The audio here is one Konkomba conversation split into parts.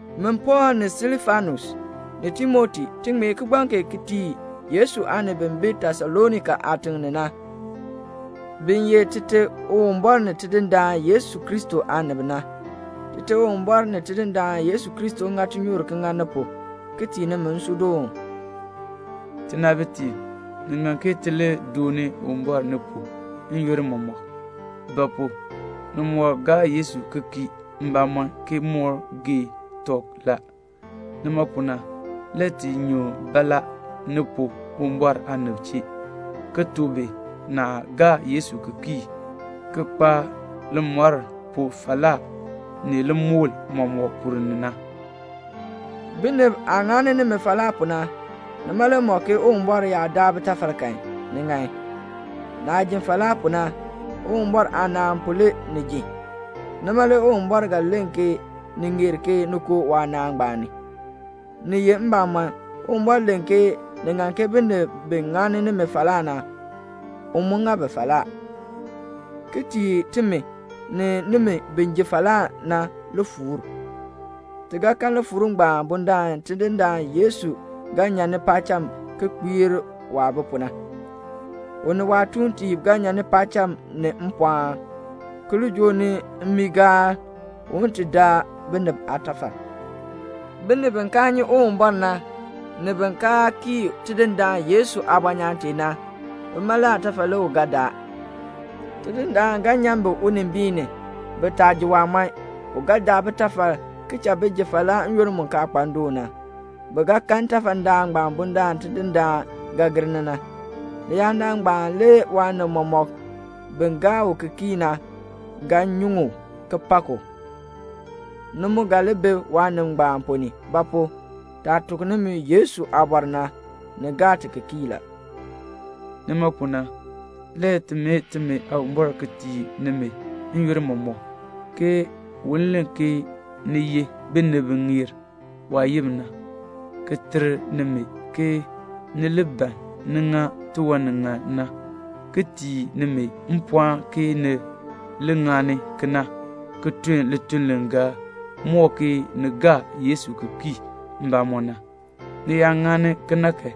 Min Pɔɔl ni Silfanus, ni Timoti, ti ŋmee kigbaŋ kee ti tii Yesu aanib bi bi Tesalonika aatiŋ ni na, bi ye Tite Uwumbɔr ni Tidindaan Yesu Kristo aanib na. Tite Uwumbɔr ni Tidindaan Yesu Kristo ŋa tinyoor ki ŋa ni pu ki tii nimi nsuudoon. Tinaabitiib, ni ŋan ke ti li dooni Uwumbɔr ni pu n-yoonn mɔmɔk; ba pu? ni moo gaar Yesu ki kii mbamɔm ki moo gee tɔb la. Nima pu na le ti nyu baalaa ni pu Uwumbɔr aanib chee, ki tuk bi naah gaa Yesu ki kii ki kpa limɔr pu falaa ni limukl mɔmɔk ponn ni na. Binib aah ŋani nimi falaa pu na, nima le mɔk ke Uwumbɔr yaa daa bitafal kan, ni ŋan. Naah ji falaa pu na, Uwumbɔr aanaan pu le ni ji. Nima le Uwumbɔr ga len ke ni ŋeer ke ni koo waanaan ngbaan ni. Ni ye mbamɔn, Uwumbɔr len ke ni ŋan ke binib bi ŋani nimi falaa na, u mu ŋa bi falaa, ki tii timi ni nimi bi ji falaa na lifuur. Ti ga kan lifuur ngbaan bundaln Tidindaan Yesu ga nyan ni paacham ki kpiir waah bi pu na. U ni waatuuntiib ga nyan ni paacham ni mpɔɔn, ki li joo ni mmiigaal, un ti daa binib aatafal. Binib bi kaa nyi Uwumbɔr na, ni bin kaa kii Tidindaan Yesu aabɔnyaan tee na, bima le aatafal le u ga daa. Tidindaan ga nyan bi unimbiin ni, bi taa ji waamɔɔn. U ga daa bitafal, ki cha bi ji falaa n-yoonn mu kaa kpa ndoon na. Bi ga kan ntafadaan ngbaan bundaln Tidindaan ga gir ni na. Leyaadaal ngbaan le waanib mɔmɔk bi gaa u ki kii na ga nyuŋ u, ki pak u. Ni mu ga li bi waanib ngbaan ponn ni; ba pu? taah tuk nimi Yesu aabɔr na, ni gaa ti ki kii la. Nima pu na, le ti mee timi Aawumbɔr ki tii nimi n-yoonn mɔmɔk ke un len ke ni ye binib bi ŋeer waayim na, ki ter nimi ke ni li ban ni ŋa tiwan ni ŋan na, ki tii nimi mpɔɔn ke ni ŋani kena ki tun lituln li ga mɔk ke ni gaa Yesu ki kii mbamɔm. Ni yaa ŋani kena kan,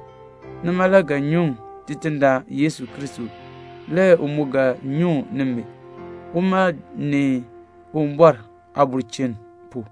nima le ga nyuŋ Tidindaan Yesu Kristo, le u mu ga nyuŋ nimi, uma ni Uwumbɔr aabulchin pu.